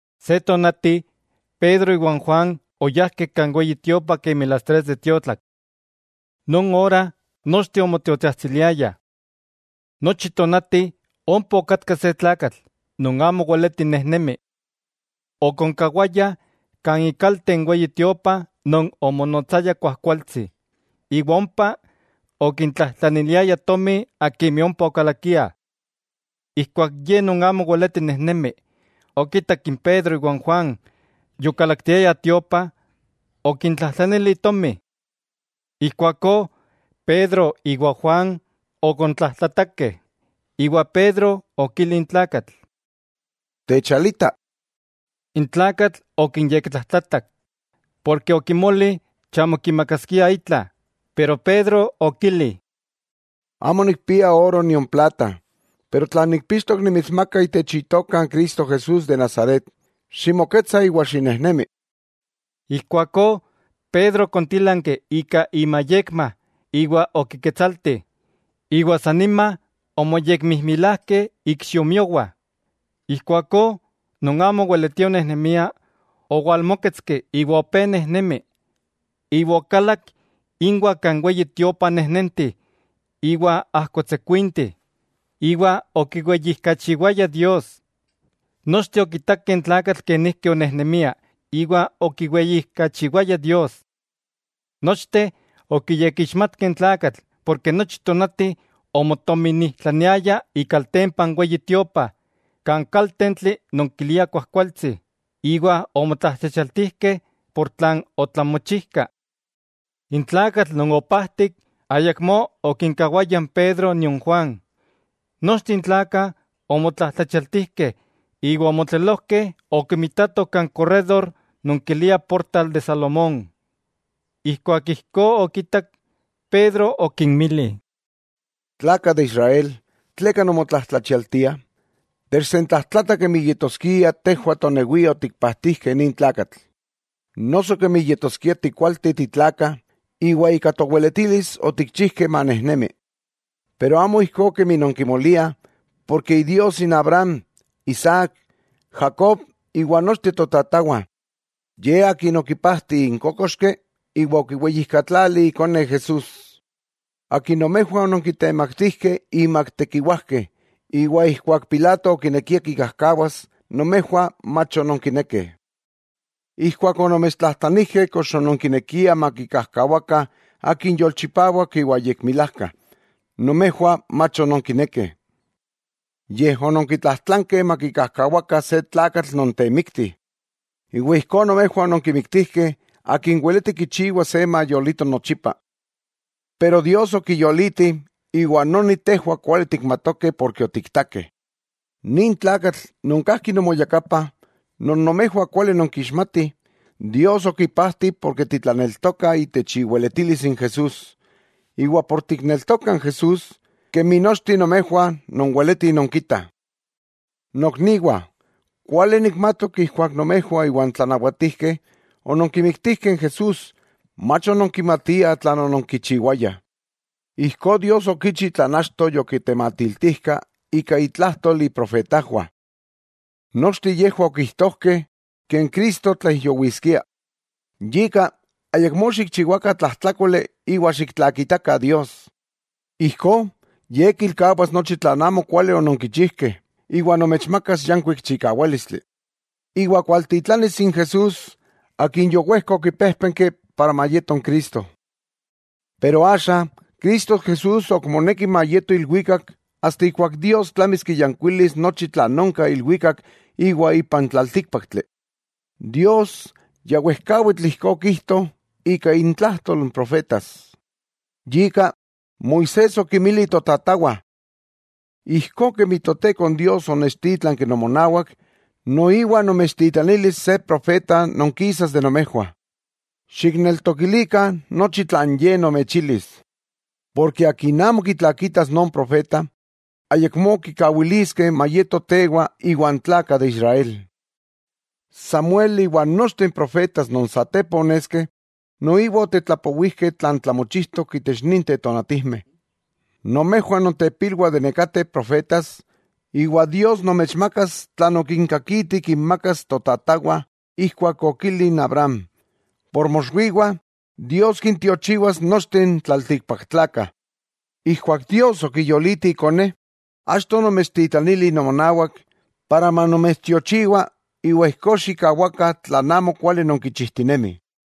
Se tonati, Pedro iwa n Juan oyajkeh kan Weyi Tiopa kemi las tres de tiotlak. Non ora nochteh omotiotsajtsiliayah. Nochi tonati ompa okatka se tlakatl non amo weleti nejnemi. Okonkawayah kan ikalte n Weyi Tiopa non omonotsaya Kuajkualtsi, iwa ompa okintlajtlaniliaya tomi akimeh ompa okalakiah. Ijkuak ye non amo weleti nejnemi okitak n Pedro iwa n Juan, yokalaktiayah tiopa, okintlajtlanili tomi. Ijkuakó Pedro iwa Juan okontlajtlatakeh, iwa Pedro okili n tlakatl: —Techalita. N tlakatl okinyektlajtlatak, porke okimoli chamo kimakaskiah itla. Pero Pedro okili: —Amo nikpia oro nion plata, pero tlan nikpixtok nimitsmaka: Itech Itoka n Cristo Jesús de Nazaret, ¡ximoketsa iwa xinejnemi! Ijkuakó Pedro okontílanki ika imayekma iwa okiketsalti, iwa san nima omoyekmijmilajkeh ikxiomiowah. Ijkuakó non amo oweletia onejnemia owalmóketski iwa opé nejnemi. Iwa okalak inwah kan Weyi Tiopa, nejnenti iwa ajkotsekuinti iwa okiweyijkachiwaya Dios. Nochteh okitakeh n tlakatl kenijki onejnemia iwa okiweyijkachiwaya Dios. Nochteh okiyekixmatkeh n tlakatl porke nochi tonati omotominijtlaniaya ikaltempa n Weyi Tiopa kan kaltentli non kilia Kuajkualtsi, iwa omotlajtlachialtijkeh por tlan otlamochijkah. N tlakatl non opajtik ayakmó okinkawaya n Pedro nion Juan. Nochteh n tlakah omotlajtlachialtijkeh iwa omotlelojkeh okimitatoh kan korrédor non kiliah Portal de Salomón. Ijkuak ijkó okitak, Pedro okinmili: —Tlakah de Israel, ¿tleka nonmotlajtlachialtiah? Techsentlajtlatah kemi yetoskia tejwah tonewiah otikpajtijkeh nin tlakatl; noso kemi yetoskia tikualteh titlakah, iwa ika toweletilis otikchijkeh manejnemi. Pero amo ijkó kemi non kimoliah; porke Idios Abraham, Isaac, Jacob iwa nochteh totatawah, Ye Akin okipajti n kókoxki iwa okiweyijkatlali Ikone Jesús, Akin nomejwah ononkitemaktijkeh inmak n tekiwajkeh, iwa ijkuak Pilato okinekia kikajkawas, nomejwah mach ononkinekeh. Ijkuak onomechtlajtlanijkeh kox ononkinekiah makikajkawakah Akin yolchipawak iwa yekmilajka, nomejwah mach ononkinekeh, yej ononkitlajtlankeh makikajkawakah se tlakatl non temikti. Ijkó nomejwah ononkimiktijkeh Akin weleti kichiwa se mayolito nochipa. Pero Dios okiyoliti, iwa noni tejwah kuali tikmatokeh porke otiktakeh. Nin tlakatl non kajki nomoyakapa, non nomejwah kuali nonkixmatih, Dios okipajti porke titlaneltokah itech iweletilis n Jesús. Iwa por tikneltokah n Jesús, kemi nochteh nomejwah nonweletih nonkitah. 'Nokniwah, kuali nikmatok ijkuak nomejwah iwa n tlanawatijkeh ononkimiktijkeh n Jesús, mach ononkimatiah tlan ononkichiwayah. Ijkó Dios okichi tlan achto yokitematiltijka ika intlajtol iprofetajwah. Nochteh yejwah okijtojkeh Cristo tlaijyowiskia. Yika, ayakmó xikchiwakah tlajtlákoli iwa xiktlakitakah Dios. Ijkó Ye kilkawas nochi tlan amo kuali ononkichijkeh, iwa nomechmakas yankuik chikawálistli, iwa kualtitlanis n Jesús, Akin yowejka okipéjpenki para mayeto n Cristo. Pero axa, Cristo Jesús ok moneki mayeto ilwikak asta ijkuak Dios tlamis kiyankuilis nochi tlan onka ilwikak iwa ipa n tlaltíkpaktli. Dios ya wejkawitl ijkó okijto ika intlajtol n profetas. Yika, Moisés okinmili totatawah: “Ijkó kemi n Toteko Dios onechtítlanki nomonawak, noiwa nomechtitlanilis se profeta non kisas de nomejwah. Xikneltokilikah nochi tlan Ye nomechilis. Porke akin amo kitlakitas non profeta, ayakmó kikawiliskeh mayeto tewa iwan tlakah de Israel.” 'Samuel iwa nochteh n profetas non satepa oneskeh, noiwa otetlapowijkeh tlan tlamochijtok itech ninteh tonatijmeh. Nomejwah nontepilwah de nekateh profetas; iwa Dios nomechmakas tlan okinkakiti kinmakas totatawah ijkuak okili n Abraham: “Por moxwiwah, Dios kintiochiwas nochteh n tlaltikpaktlakah.” Ijkuak Dios okiyoliti Ikone, achto onomechtitlanili nomonawak, para manomechtiochiwa, iwa ijkó xikkawakah tlan amokuali nonkichijtinemih.